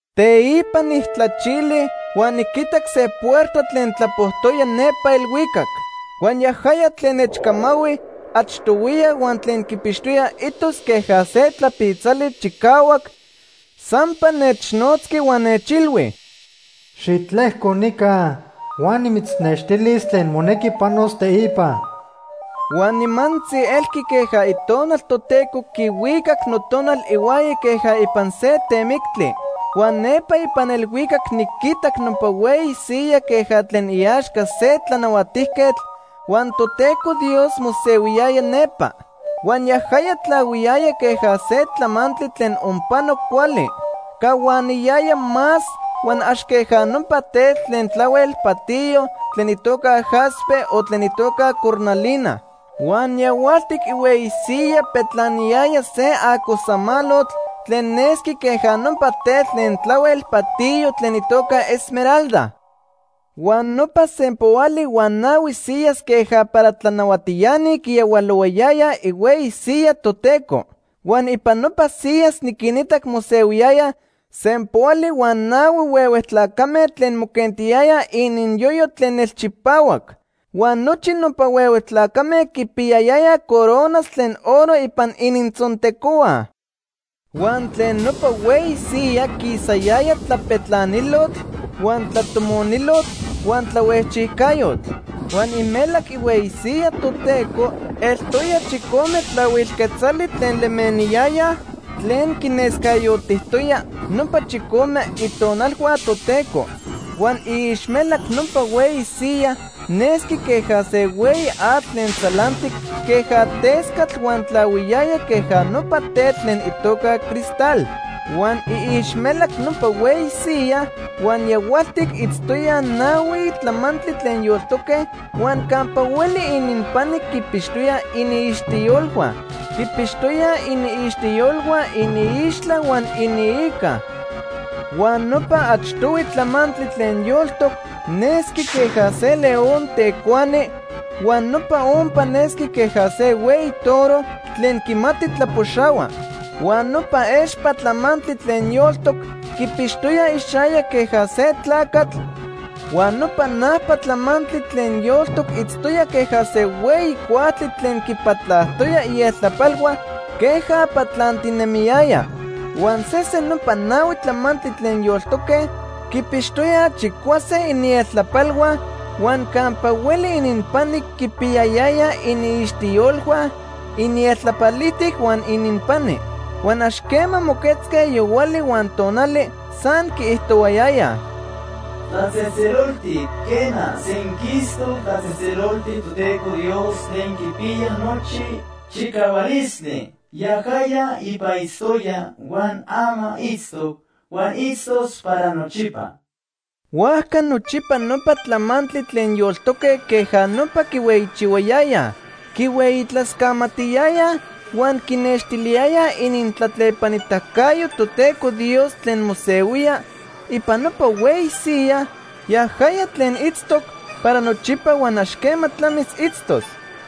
Teipa nijtlachili huan niquitac se puerta tlen tlapojtoya nepa elhuicac. Huan yajaya tlen nechcamahui achtohuiya huan tlen quipixtoya itos queja se tlapitzali chicahuac, sampa nechnotzqui huan nechilhui: “Xitlejco nica huan nimechnextilis tlen monequi panos teipa.” Huan nimantzi elqui queja Itonal Toteco quihuicac notonal ihuaya queja ipan se temictli. Huan nepa ipan elhuicac niquitac nopa hueyi siyaj queja tlen iaxca se tlanahuatijquetl, huan Toteco Dios mosehuiyaya nepa. Huan yajaya tlahuiyaya queja se tlamantli tlen onpano cuali. Cahuaniyaya más huan ax queja nopa tetl tlen tlahuel patiyo tlen itoca jaspe o tlen itoca cornalina. Huan yahualtic ihueyi siyaj petlaniyaya se acosamalotl tlen nesqui queja nopa tetl tlen tlahuel patiyo tlen itoca esmeralda. Huan nopa sempoali huan nahui siyas queja para tlanahuatiani quiyahualohuayayaj ihueyi siyaj Toteco. Huan ipan nopa siyas niquinitac mosehuiyayaj sempoali huan nahui huehue tlacame tlen moquentiyayaj ininyoyo tlen nelchipahuac. Huan nochi nopa huehue tlacame quipiyayayaj coronas tlen oro ipan inintzontecohua. Huan tlen nopa hueyi siyaj quisayaya tlapetlanilotl huan tlatomonilotl huan tlahuejchijcayotl. Huan imelac ihueyi siyaj Toteco eltoya chicome tlahuil quetzali tlen lemeniyayaj tlen quinescayotijtoya nopa chicome itonalhua Toteco. Huan iixmelac nopa hueyi siyaj nesqui queja se hueyi atl tlen tzalantic queja tescatl huan tlahuiyaya queja nopa tetl tlen itoca cristal. Huan iixmelac nopa hueyi siyaj huan yahualtic itztoyaj nahui tlamantli tlen yoltoque huan campa hueli ininpani quipixtoyaj iniixtiyolhua. Quipixtoyaj iniixtiyolhua iniixtla huan iniica. Huan nopa achtohui tlamantli tlen yoltoc nesqui queja se león tecuani huan nopa ompa nesqui queja se hueyi toro tlen quimati tlapoxahua. Huan nopa expa tlamantli tlen yoltoc quipixtoya ixayac queja se tlacatl, huan nopa najpa tlamantli tlen yoltoc itztoya queja se hueyi cuajtli tlen quipatlajtoya ieltlapalhua queja patlantinemiyaya. Huan sesen nopa nahui tlamantli tlen yoltoque quipixtoyaj chicuase inieltlapalhua huan campa hueli ininpani quipiyayayaj iniixtiyolhua inieltlapalijtic huan ininpani. Huan ax quema moquetzque yohuali huan tonali, san quiijtohuayayaj: “Tlatzejtzeloltic, quena, senquistoc tlatzejtzeloltic Toteco Dios Tlen Quipiya Nochi Chicahualistli. Yajaya ipa itztoya, huan ama itztoc, huan itztos para nochipa.” Huajca nochipa nopa tlamantli tlen yoltoque queja nopa quihueyichihuayayaj, quihueyitlascamatiyayaj huan quinextiliyayaj inintlatlepanitacayo Toteco Dios tlen mosehuía ipan nopa hueyi siyaj, yajaya tlen itztoc para nochipa huan ax quema tlamis itztos.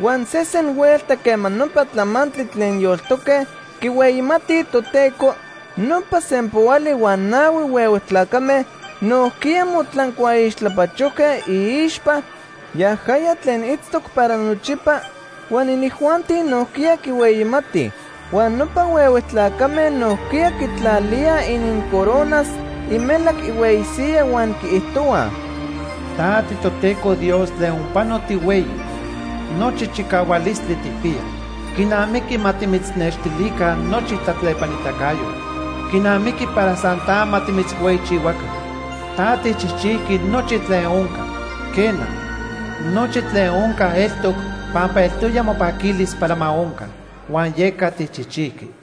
Huan sesen huelta quema nopa tlamantli tlen yoltoque quihueyimatij Toteco, nopa sempoali huan nahui huehue tlacame nojquiya motlancuaixtlapachojque iixpa yajaya tlen itztoc para nochipa, huan inijuanti nojquiya quihueyimatij. Huan nopa huehue tlacame nojquiya quitlalíaj inincoronas imelac ihueyi siyaj huan quiijtohuaj: “Ta tiToteco Dios tlen onpano tihueyi. Nochi chicahualistli tijpiya. Quinamiqui ma timitznextilica nochi tlatlepanitacayotl. Quinamiqui para san ta ma timitzhueyichihuaca. Ta tijchijchijqui nochi tlen onca. Quena, nochi tlen onca eltoc pampa eltoya mopaquilis para ma onca, huan yeca tijchijchijqui.”